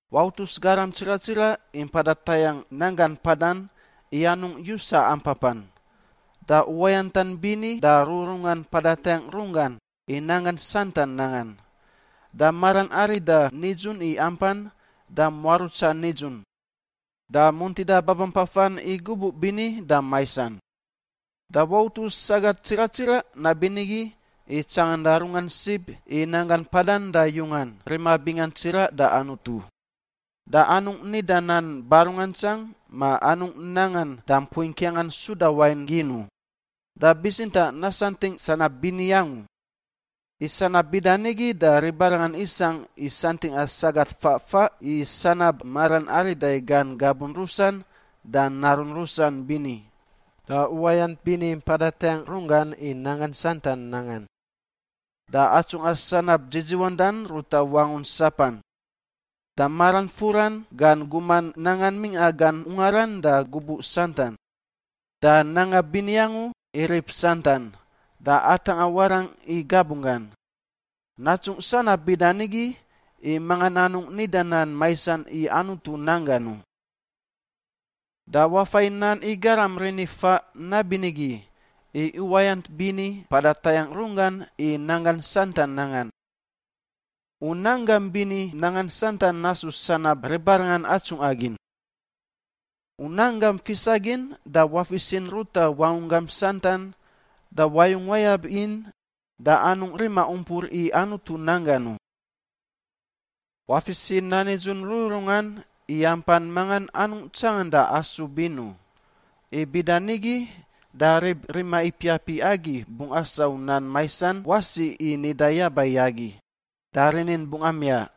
Wautus garam tsiraꞌ tsiraꞌ i mpada tayangꞌ nanggan mpadan i anungꞌ yusa ampapan, da uwayantan bini da rururungan mpada tayangꞌ runggan i nanggan santan nangan, da maran arida nidzun i ampan, da muarutsa nidzun, da muntida babampafan i gubuꞌ bini da maisan. Da wautus sagat tsiraꞌ tsiraꞌ nabinigi i tsanganda runggan sib i nanggan mpadan da yungan rima bingan tsiraꞌ da Anutu, da anungꞌ nida nan barungantsang, ma anungꞌ nangan da mpui ngkiangan suda wain gin u, da bitsintaꞌ nasantingꞌ sanab bini angu. I sanab bida nigi da ribarangan isangꞌ i santingꞌa sagat faꞌ faꞌ i sanab maran arida i gan gabun rusan da narun rusan bini, da uwayant bini mpada tayangꞌ runggan i nanggan santan nangan, da atsungꞌa sanab dzidziwandan ruta wangun sapan, da maran furan gan guman nangan mingꞌa gan ungaran da gubuꞌ santan, da nanga bini angu i rib santan, da atangꞌa warangꞌ i gabunggan. Natsungꞌ sanab bida nigi i mangan anungꞌ nida nan maisan i Anutu nan gan u. Da wafai nan i garam rinifaꞌ nabinigi i uwayant bini mpada tayangꞌ runggan i nanggan santan nangan. U nanggam bini nangan santan nasu sanab ribarangan atsungꞌa gin. U nan gam fisa gin da wafisin ruta wangunggam santan da wayung wayab in da anungꞌ rima umpur i Anutu nan gan u. Wafis i nan nidzun rururungan i ampan mangan anungꞌ tsanganda asub in u. I bida nigi da rib rima ipiap i agi bungꞌ asau nan maisan wasi i nida yaba i agi, da rinin bungꞌ amiaꞌ.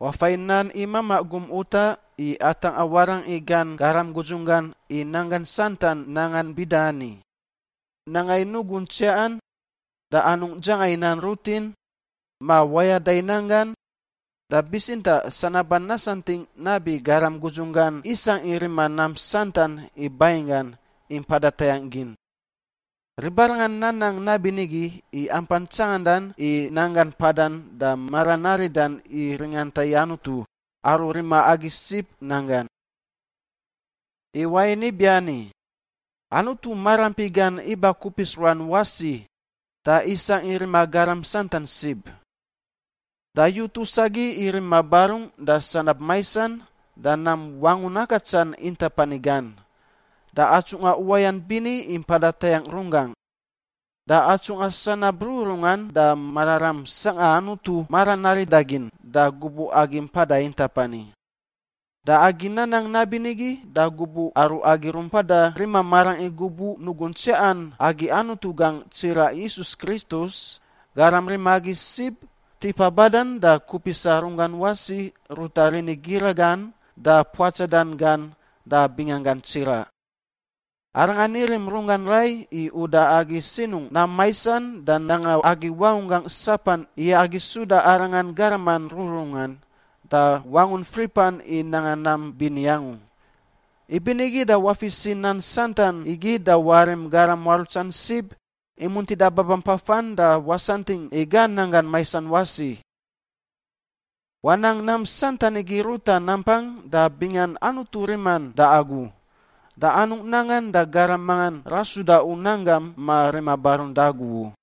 Wafai i nan i mamaꞌ gum utaꞌ i atangꞌa warangꞌ i gan garam gudzunggan i nanggan santan nangan bida ani: nanga i nugun tsiaꞌan, da anungꞌ dzanga i nan rutin ma wayada i nanggan, da bitsintaꞌ sanaban nasantingꞌ nabi garam gudzunggan isangꞌ i rima nam santan i banginggan i mpada tayangꞌ gin. Ribarangan nanang nabinigi i ampan tsanganda i nanggan mpadan da maran aridan i ringanta i Anutu, aru rima agi sib, nan gan. I wain ibiani, Anutu maraampi gan iba kupis ruan wasi da isangꞌ i rima garam santan sib. Da yutus agi i rima barungꞌ da sanab maisan da nam wangun akatsan intap ani gan, da atsungꞌa uwayant bini i mpada tayangꞌ runggangꞌ, da atsungꞌa sanab rururungan da mararam sangꞌa Anutu maran arida gin da gubuꞌ agi mpada intap ani. Da agi nanang nabinigi da gubuꞌ aru agi rumpada rima marangꞌ i gubuꞌ nugun tsiaꞌan agi Anutu gangꞌ tsiraꞌ Yisus Kristus, Garam rima agi sib, tipa badan da kupisa runggan wasi ruta rini gira gan da puatsadan gan da binganggan tsiraꞌ. Arangan irim runggan rai i uda agi sinungꞌ nam maisan da nanga agi wangunggangꞌ sapan i agi suda Arangan garaman rururungan da wangun fripan i nanga nam bini angu. Ibinigi da wafis i nan santan igi da warim garam muarutsan sib i muntida babampafan da wasantingꞌ i gan nanggan maisan wasi. Wanang nam santan igi ruta nampang da bingan Anutu riman da agu. Da anungꞌ nangan da garam manga rasuda u nan gam ma rima barun da agu u.